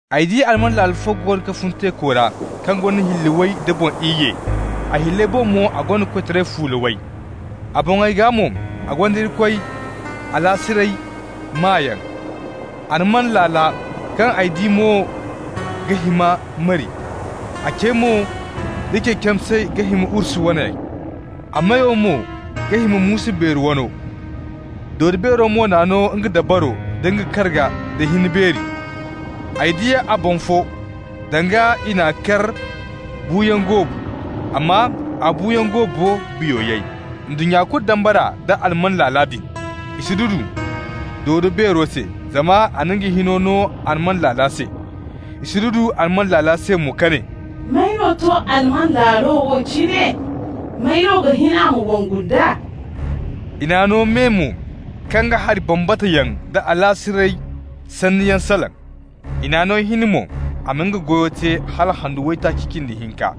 Ay di alman laalo fo goono ga fun teeko ra kaŋ gonda hilli way da boŋ iyye. A hilley boŋ mo a gonda koytaray fuula way. A boŋey gaa mo a gonda Irikoy alaasiray maayaŋ. Alman laala kaŋ ay di mo ga hima mari, a cey mo d'a ce camsey ga hima urs waney, a meyo mo ga hima muusu beeri wano. Dodo-beero mo n'a no nga dabaro da nga karga da hin beeri. Ay di a boŋ fo, danga i n'a kar buuyaŋ goobu, amma a buuyaŋ goobo biyo yay. Ndunnya kulu dambara nda alman laala din. I sududu dodo-beero se, zama a na nga hino no alman laala se. I sududu alman laala se mo ka ne: «May no to alman laalo wo cine? May no ga hin a ma wongu nd'a?» I n'a no me mo kaŋ ga hari bambata yaŋ da alaasiray sanniyaŋ salaŋ. I n'a no hin mo a ma nga goyo te hala handu waytaaci cindi hinka.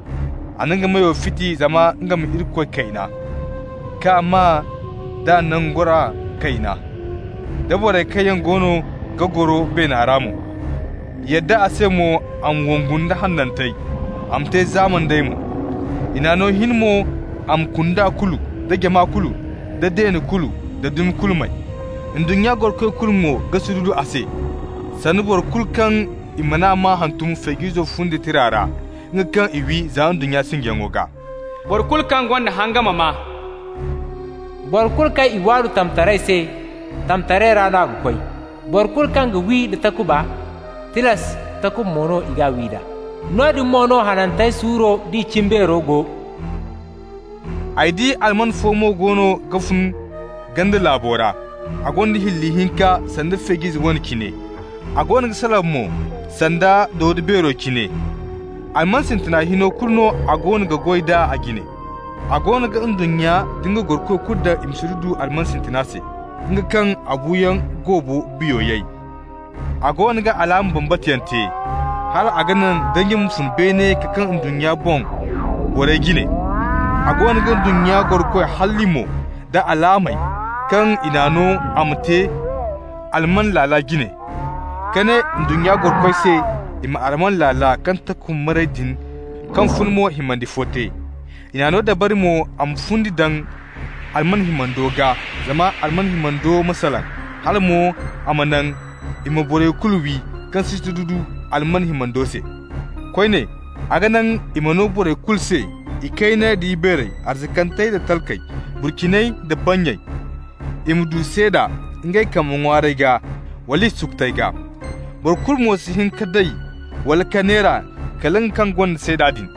A na nga meyo fiti zama nga ma Irikoy kayna, k'a maa d'a nangora kayna, da borey kaŋ yaŋ goono ga goro beena ra mo. I yadda a se mo a ma wongu nda hanantey, a ma te zaama nd'ey mo. I n'a no hin mo a ma kunda kulu, da jama kulu, da deene kulu da dumi kulu may. Ndunnya gorokoy kulu mo ga sududu a se, sanda boro kulu kaŋ i man'a maa hantum Feej'izo fundi tira ra, nga kaŋ i wi za ndunnya sinjiyaŋo gaa. Boro kulu kaŋ gonda hanga ma maa. Boro kulu kaŋ i waadu tamtaray se, tamtaray ra no a ga koy. Boro kulu kaŋ ga wi nda takuba, tilas, takuba mo no i g'a wi nd'a. Noodin mo no hanantey suuro d'i cimbeero go. Ay di alman fo mo goono ga fun ganda laabo ra. A gonda hilli hinka sanda feej'ize wane cine. A goono ga salaŋ mo sanda dodo-beero cine. Alman sintina hino kulu no a goono ga goy d'a a jine. A goono ga ndunnya nda nga gorokoy kulu daŋ i ma sududu alman sintina se, nga kaŋ a buuyaŋ goobo biyo yay. A goono ga alaama bambata yaŋ te, hal a ga naŋ danji ma fun beene ka kaa ndunnya boŋ borey jine. A goono ga ndunnya gorokoy halli mo da alaamey kaŋ i n'a no a ma te alman laala jine, ka ne ndunnya gorokoy se i ma alman laala kaŋ takuba maray din kaŋ funa mo himandi fo te. I n'a no dabari mo a ma fundi daŋ alman himando gaa zama alman himando ma salaŋ, hala mo a ma naŋ i ma borey kulu wi kaŋ si sududu alman himando se. Koyne, a ga naŋ i ma no borey kulu se, ikayney da ibeerey, arzakantey da talkey, burciney da bannyey, i ma du seeda ngey kambe ŋwaarey gaa wala i sukutey gaa. Boro kulu mo si hin ka day wala ka neera kala nga kaŋ gonda seeda din,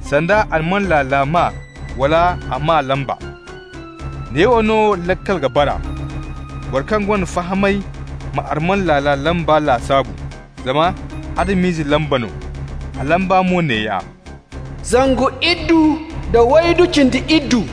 sanda alman laala maa wala a maa lamba. Neewo no laakal ga bara: boro kaŋ gonda fahamay ma alman laala lamba lasaabu, zama Adam-ize lamba no. A lamba mo neeya: zangu iddu nda waydu cindi iddu.